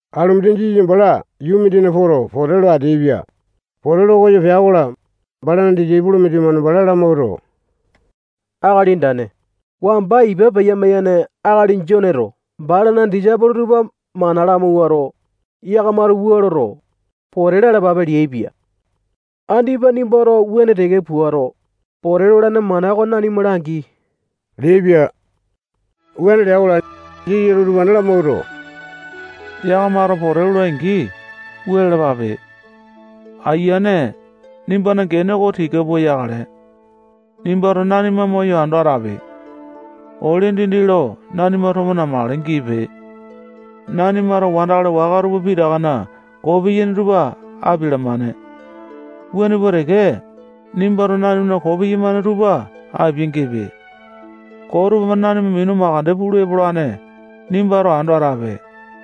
Alumindi Jisasa bala yuu mindinga poto, pote lo ateaipia. Pote lo koyo pea-kola, balana disaipolo mindimane bala lamawuato, Akali Andane, wamba ipa peya-maiyane akali Joneto balana disaipolo tupa mana lamawuato, yakamato wua loto, pote lalapape leaipia. Andipa nimbato wuane teke puato, pote lolane mana oko nanima langi leaipia. Wuane lea-kola, Jisasato utupane lamawuato, yakamato pote lolai-angi, wua lalapape: Ayiane, nimbana gene oko tika pua yakale. Nimbato nanima moyo ando atape. Ole dindi lo nanima tomo namakale giipe. Nanimato wandakali waka tupa pitakana koo piyaini tupa apialamane. Wuane pua teke, nimbato nanimana koo piyamane tupa apia-gipe. Koo tupamane nanima minu makande pulu epolane, nimbato ando atape.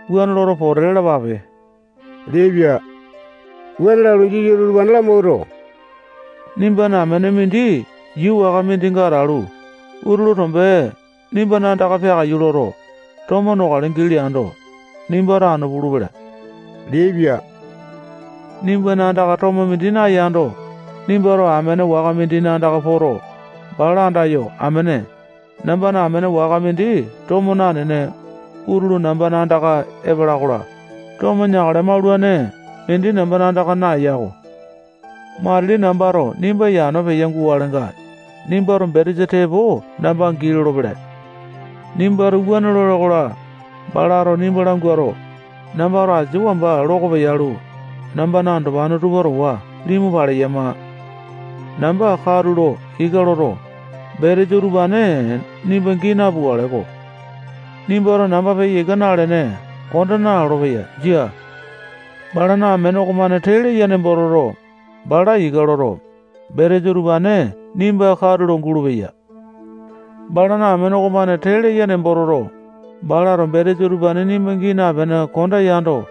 Wuane loto, pote lalapape leaipia. Wuane lalu, Jisasato utupane lamawuato, nimbana amene mindi yuu waka mindinga atalu, utulu tombe nimba andaka peakaiyu loto, tomo nokale gii leando, nimbato anu pulu-pelepe leaipia. Nimbana andaka tomo mindi nayando, nimbato amene waka mindina andaka poto, bala andayo, amene, nambana amene waka mindi tomo nanene, utulu namba andaka epala-kola, tomo neakale maulane mindi namba andaka naeya-ko. Matili nambato nimba yano peyo gukalenga, nimbato betesa tepo namba gii lolopele. Nimbato wuane lole-kola, balato nimba languato, nambato asia wamba loko peyalu, nambana andopane tupa towa limu paleyama. Namba katulo ika loto, betesa utupane nimba gii napukale-ko. Nimbato namba peya ika nalene konda nalolo-peya. Jia. Balana amene okomane tee leya nembo toto, bala ika loto, betesa utupane nimba katulo gulupeya. Balana amene okomane tee leya nembo toto, balato betesa utupane nimba gii napene konda yando,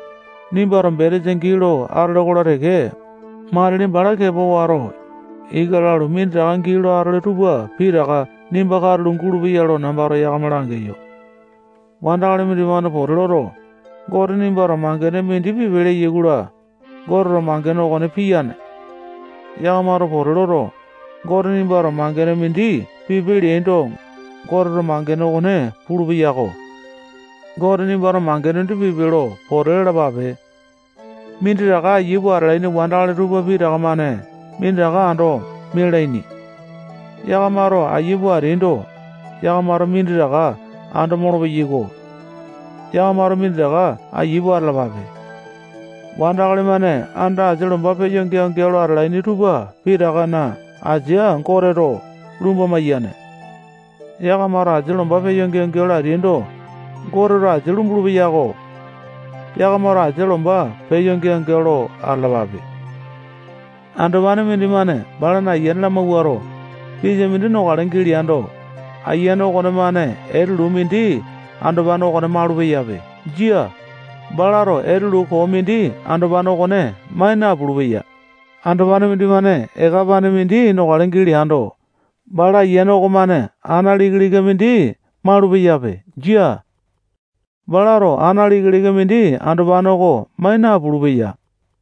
nimbato betesa gii lo atole-kola teke, matili bala kepa wato, ika lalu, minditaka gii lo atole tupa pitaka nimba katulo gulupeya lo nambato yakama langeyo. Wandakali-mane pote loto, Gote nimbato mangene mindi pipe leyai-kola, Goteto mangene okone piyane. Yakamato pote loto, Gote nimbato mangene mindi pipe leaindo, Goteto mangene okone pulupeya-ko. Gote nimbato mangene mindi pipe lo pote lalapape. Minditaka ayia pua atalaini wandakali tupa pitaka-mane minditaka ando mialaini. Yakamato aiya pua ateaindo, yakamato minditaka ando molopeyai-ko. Yakamato minditaka ayia pua atalapape. Wandakali-mane anda asia lomba peya geao-geao lo atalaini tupa pitakana asia Goteto lumba maiyane. Yakamato asia lomba peya geao-geao lo ateaindo, Goteto asia lumbulu-peyako. Yakamato asia lomba peya geao-geao lo atalapape. Andopane mindimane balana ayiane lamawuato, pisa mindi nokale gii leando, ayiane okonemane etelu koo mindi andopane okone malupeyape. Jia, balato etulu koo mindi andopane okone mai napulu-peya. Andopane mindimane eka apane mindi nokale gii leando, bala ayiane okomane ana lika-lika mindi malupeyape. Jia. Balato ana lika-lika mindi andopane okone mai napulu-peya.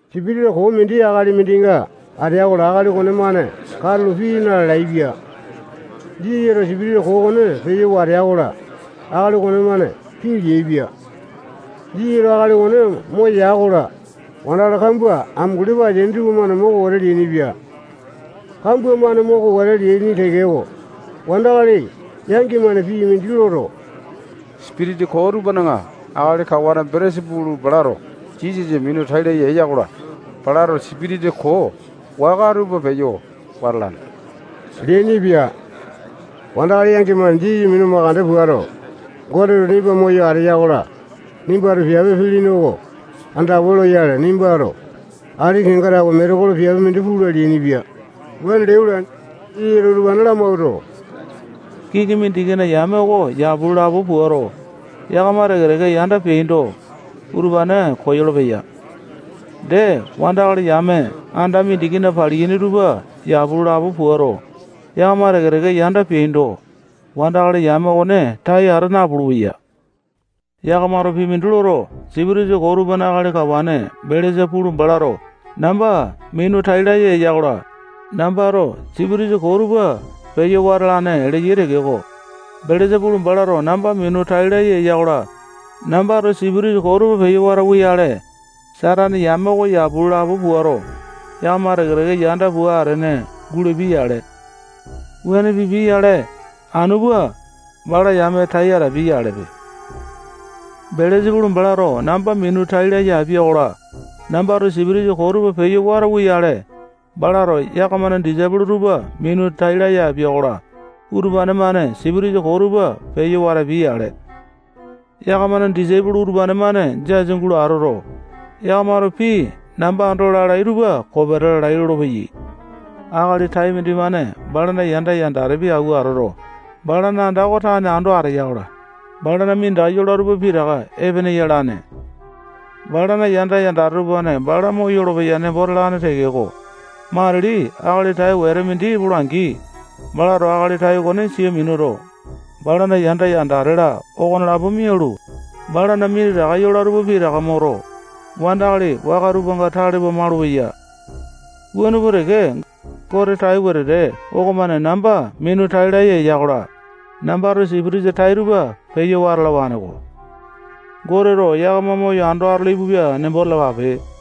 Sipitisa koo mindi akali mindinga atea-kola, akali okonemane katulo pii naleaipia. Jisasato sipitisa koo okone peyo watea-kola, akali okonemane pii leaipia. Jisasato akali okone moya-kola, wandakali kambua amunguli pua ateaini tupamane moko wete leainipia. Kambua-mane moko wete leaini tekeko, wandakali yangi-mane pii mindi loto, sipitisa koo tupana akali kawane Belesa-pulu balato Jisasa minu tai laya eya-kola, balato sipitisa koo waka tupa peyo wata alane leainipia. Wandakali yangi-mane Jisasa minu mandeke puato, Goteto nimba moyo ateya-kola, nimbato piape pilini oko andawa loyale, nimbato ati kenga tawe metekolo piape mindi pula leainipia. Wuane leai-kola, Jisasato utupane lamawuato, kiŋi mindikina yame oko yapu lo lapo puato, yakama teke-teke yanda peapindo, utupane koyolo-peya. Dee, wandakali yame anda mindikina paliyaini tupa yapu lo lapo puato, yakama teke-teke yanda peapindo, wandakali yame okone tai ata napulu-peya. Yakamato pii mindi loto, sipitisa koo tupana akali kawane Belesa-pulu balato namba minu tai laya eya-kola, nambato sipitisa koo tupa peyo wata alane leyai tekeko, Belesa-pulu balato namba minu tai laya eya-kola, nambato sipitisa koo tupa peyo watauwa-yale, Satane yame oko yapu lo lapo puato, yakama teke-teke yanda pua atene gulapia-yale. Wuane pipia-yale, anu pua, balana yame tai atapia-yalepe. Belesa-pulu balato namba minu tai laya apia-kola, nambato sipitisa koo tupa peyo watauwa-yale, balato yakamana disaipolo tupa minu tai laya apia-kola, utupane-mane sipitisa koo tupa peyo watapia-yale. Yakamana disaipolo utupane-mane jasa gulo atoto, yakamato pii namba ando lalai tupa kopeta lalai lolopeyai. Akali tai mindimane balana yanda, yandatepi, awua atoto, balana anda oko tane ando ateya-kola, balana minditaka yola tupa pitaka epene yalane. Balana yanda, yandate tupamane bala moyolo-peya nembo talane tekeko, matili akali tai wetete mindi epola-angi, balato akali tai okone sia minuto, balana yanda yandate-la okonelapo mialu, balana minditaka yola tupa pitaka moto, wandakali waka tupanga tale pua malupeya. Wuane pua teke, Gote tai wetete okomane namba minu tai laya eya-kola, nambato sipitisa tai tupa peyo wata alawane-ko. Goteto yakama moyo ando atolo ipupia nembo talapape.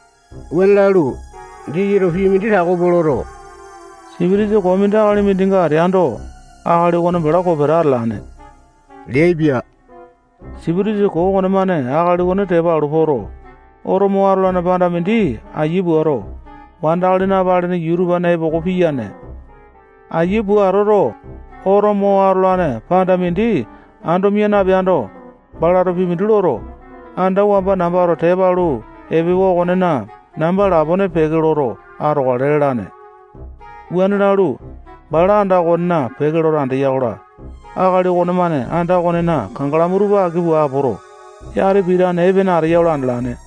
Wuane lalu, Jisasato pii mindi tako pua loto, sipitisa koo mindi akali mindinga ateando, akali okone bala kopeta atalane leaipia. Sipitisa koo okonemane akali okone tepa alu poto, oto mo atolane panda mindi ayia puato, wandakali napalene yuu tupana epoko piyane. Ayia pua atoto, oto mo atolane panda mindi ando mia napeando, balato pii mindi loto, anda wamba nambato tepa alu epewa okonena namba lapone peke loto atokale lalane. Wuane lalu, bala anda okonena peke loto andeya-kola, akali okonemane anda okonena kangalamu tupa aki pua apoto, yati pitane epene ateyanga andalane.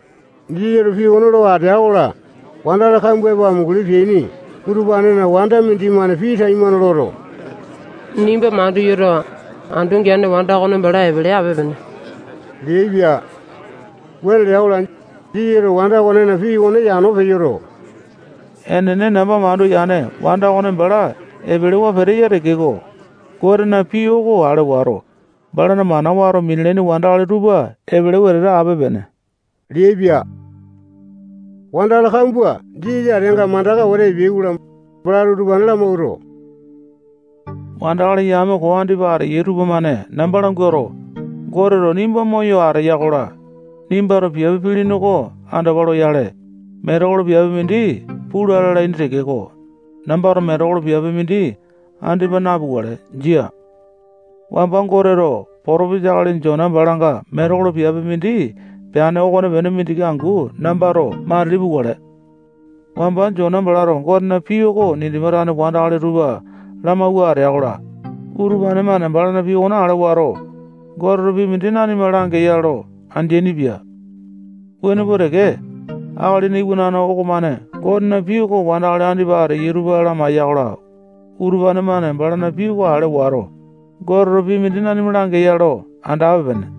Jisasato pii okone lo atea-kola, wandakali kambua epo amunguli peaini utupanena wanda mindimane pii taimane loto, nimba mandu yoto, andu geane wanda okone bala epele ape-pene leaipia. Wuane lea-kola, Jisasato wanda okonena pii leane okone yano peyoto, enene, namba mandu yane wanda okone bala epelewa peteya tekeko, Gotena pii oko ale wato, balana mana wato minalaini wandakali tupa epele wetete ape-pene leaipia. Wandakali kambua Jisasa ateanga mandaka wete epeai-kola, balato utupane lamawuato, wandakali yame koo andipa ateyai tupamane namba languato, Goteto nimba moyo ateya-kola, nimbato piape pilini oko andawa loyale, metekolo piape mindi pula lalaini tekeko, nambato metekolo piape mindi andipa napukale. Jia. Wamba Goteto potopesa akali Jona balanga metekolo piape mindi peane okonepene mindiki angu nambato matili pukale. Wamba Jona balato Gotena pii oko Ninipa tane wandakali tupa lamawua atea-kola, utupane-mane balana pii okone ale wato, Goteto pii mindi nanima langeya lo andeaini-pia. Wuane pua teke, Akalina Iwanane okomane Gotena pii oko wandakali andipa ateyai tupa lamaiya-kola, utupane-mane balana pii okone ale wato, Goteto pii mindi nanima langeya lo andape-pene.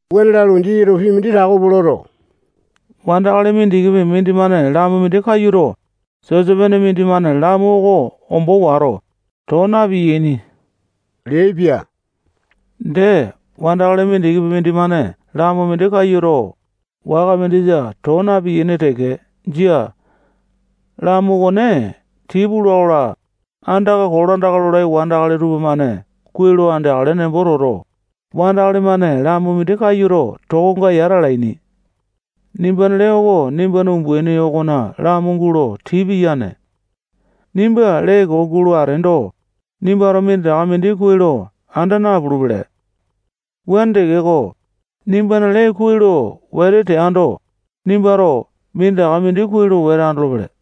Wuane lalu, Jisasato pii mindi tako pua loto, wandakali mindikipi mindimane lamu mindi kayuto, sisopene mindimane lamu okone ombo wato, too na-piyaini leaipia. Dee, wandakali mindikipi mindimane lamu mindi kayuto, waka mindisa too na-piyaini teke. Jia. Lamu okone tii pula-kola, andaka kolandaka lolai wandakali tupamane kuai lo andeakale nembo toto, wandakali-mane lamu mindi kayuto, tokonga yata alaini. Nimbana lee oko nimbana umbaini okona lamu gulo tii piyane. Nimbana lee koo guleando, nimbato minditaka mindi kuai lo anda napulupele. Wuane tekeko, nimbana lee kuai lo wete teando, nimbato minditaka mindi kuai lo wete andolopele.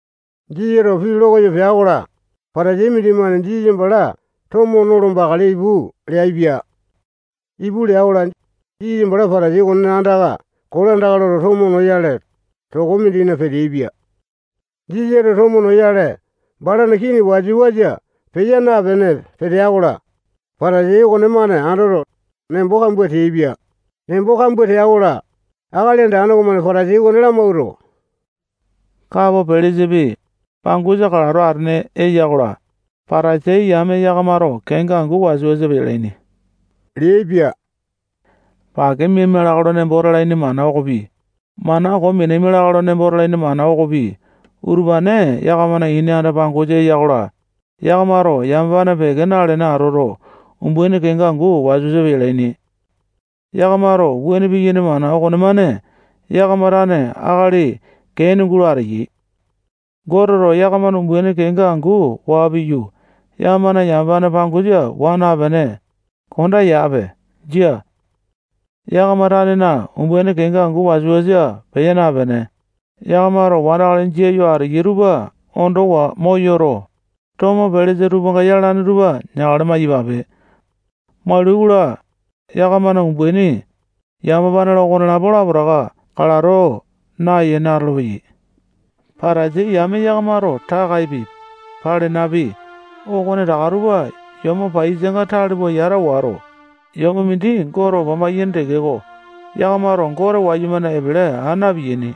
Jisasato pii lo koyo pea-kola, Patasai mindimane Jisasa bala tomo nolo bakale ipu leaipia. Ipu lea-kola, Jisasa bala Patasai okonena andaka kolandaka loto, tomo noyale, toko mindina peteaipia. Jisasato tomo noyale balana kii wasa-wasa peya napene petea-kola, Patasai okonemane andoto, nembo kambua teaipia. Nembo kambua tea-kola, Akali Andane okomane Patasai okone lamawuato, kapo pelesapi, pangosa kalato atene eya-kola, Patasai yame yakamato kenga angu wasa-wasa peyalaini leaipia. Pake miaima lakae lo nembo talaini mana okopi, mana koo minaima lakae lo nembo talaini mana okopi, utupane yakamana ini anda-pangosa eya-kola, yakamato yamapane peke nalene atoto, umbaini kenga angu wasa-wasa peyalaini. Yakamato wuane piyaini mana okonemane, yakama tane akali kee ene gulo ateyai. Goteto yakamana umbaini kenga angu waa piyu, yakamana yamapane pangosa waa napene, konda yape. Jia. Yakama tanena umbaini kenga angu wasa-wasa peya napene, yakamato wandakali jia yo ateyai tupa ondowa moyoto, tomo pelesa tupanga yalane tupa neakale maiyapape. Maulai-kola, yakamana umbaini, yamapane-la, okonelapo lapotaka kalato nayene atolopeyai. Patasai yame yakamato takaepi, palenapi, okonetaka tupa yomo paiyasanga tale pua yata wato, yomo mindi Gote opa maiyaini tekeko, yakamato Gote wayumane epele aa na-piyaini.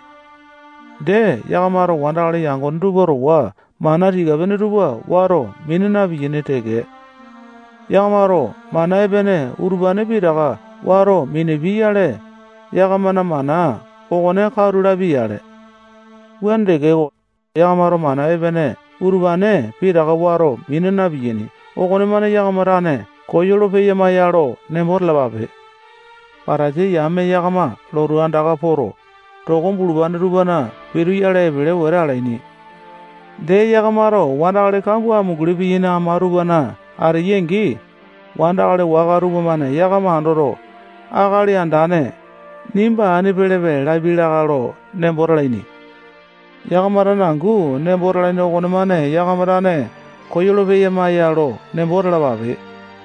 Dee, yakamato wandakali yangone tupa towa mana tika-pene tupa wato mina na-piyaini teke. Yakamato mana epene utupane pitaka wato minapiai-yale, yakamana mana okone katu lapia-yale. Wuane tekeko, yakamato mana epene utupane pitaka wato mina na-piyaini okonemane yakama tane koyolo-peyama ya lo nembo talapape. Patasai yame yakama lotu andaka poto, toko bulupane tupana pituyale epele wete alaini. Dee, yakamato wandakali kambua amunguli piyaini ama tupana ateyai-angi, wandakali waka tupamane yakama andoto, akali andane, nimba ani pelepe lapiai lakae lo nembo talaini. Yakama tane angu nembo talaini okonemane yakama tane koyolo-peyama ya lo nembo talapape.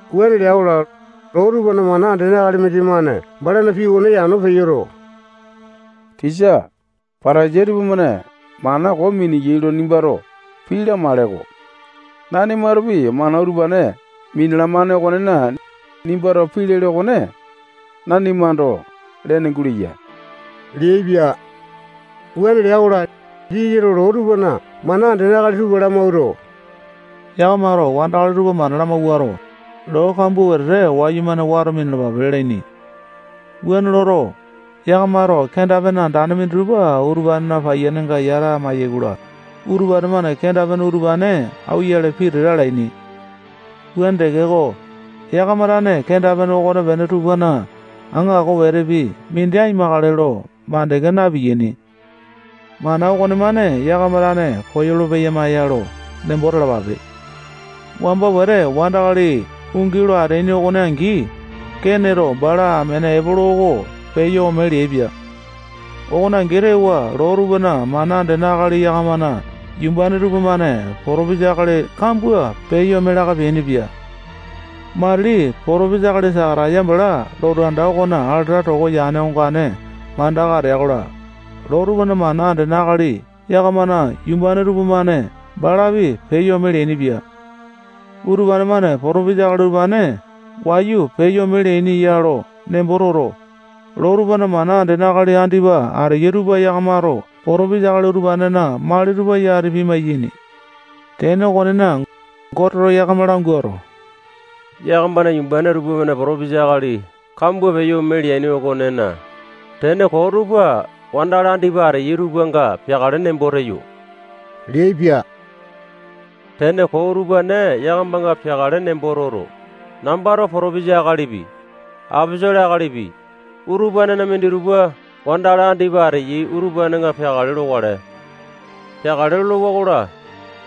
Wuane lea-kola, loo tupana mana andene akali mindimane balana pii okone yano peyoto, tisa, Patasai tupamane mana koo miniyai lo nimbato pii lamaele-ko. Nanimatopi mana utupane minalamane okonena, nimbato pii lele okone nanima ando lene guleya leaipia. Wuane lea-kola, Jisasato loo tupana mana andene akali tupa lamawuato, yakamato wandakali tupa mana lamawuato, loo kambua wetete wayumane wato minalapape lalaini. Wuane loto, yakamato kenda-pene andane minditupa utupanena paiyanenga yata maiyai-kola, utupane-mane kenda-pene utupane auwa-yale pitete alaini. Wuane tekeko, yakama tane kenda-pene okonepene tupana aŋako wetepi mindi aimakale lo makande na-piyaini. Mana okomane yakama tane koyolo-peyama ya lo nembo talapape. Wamba wete wandakali ungi lo ateaini okone angi, Keneto bala amene Epolo oko peyo ome leaipia. Okone angi tewa, loo tupana mana andene akali yakamana yumbane tupamane potopesa akali kambua peyo ome laka peainipia. Matili potopesa akali Sakataya bala lotu anda okona alata toko yane ongane mandaka atea-kola, loo tupana mana andene akali yakamana yumbane tupamane balapi peyo ome leainipia. Utupane-mane potopesa akali utupane wayu peyo ome leaini ya lo nembo toto, loo tupana mana andene akali andipa ateyai tupa yakamato potopesa akali utupanena mali tupa yati pimai-yaini. Tene okonena, Goteto yakama languato, yakamana yumbane tupamane potopesa akali kambua peyo ome leaini okonena, tene koo tupa wandakali andipa ateyai tupanga peakale nembo teyo leaipia. Tene koo utupane yakamanga peakale nembo toto, nambato potopesa akalipi, aposolo akalipi, utupanena minditupa wandakali andipa ateya utupanenga peakale lokale. Peakale lolowa-kola,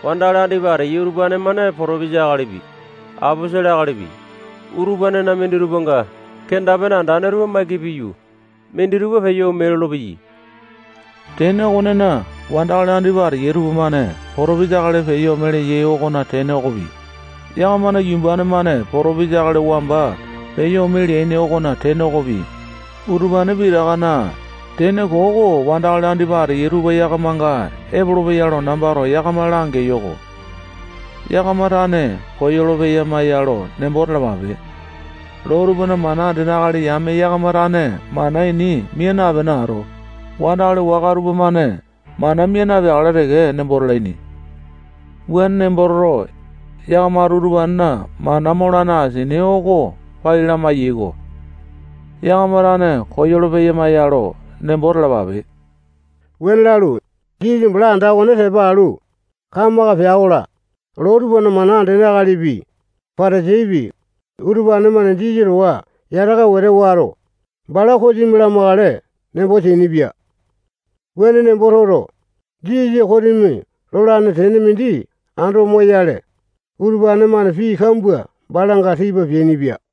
wandakali andipa ateyai utupane-mane potopesa akalipi, aposolo akalipi, utupanena minditupanga kenda-pene andane tupa maiki piyu, minditupa peyo ome lolopeyai. Tene okonena, wandakali andipa ateya tupamane potopesa akali peyo ome leyai okona tene okopi, yakamana yumbane-mane potopesa akali wamba peyo ome leaini okona tene okopi, utupane pitakana tene koo oko wandakali andipa ateyai tupa yakamanga epolopeya lo nambato yakama langeyo-ko. Yakama tane koyolo-peyama ya lo nembo talapape. Loo tupana mana andene akali yame yakama tane mana ini mia napene ato, wandakali waka tupamane mana mia napeakale teke nembo talaini. Wuane nembo toto, yakamato utupanena mana molane asini oko pai lamai-yaiko. Yakama tane koyolo-peyama ya lo nembo talapape. Wuane lalu, Jisasa bala anda okone tepa alu, kamaka pea-kola, loo tupana mana andene akalipi, Patasaipi, utupane-mane Jisasa towa yataka wete wato, bala kosimi lamakale nembo teainipia. Wuane nembo toto, Jisasa kosimi lolane tene mindi ando moyale, utupane-mane pii kambua balanga tipa peainipia.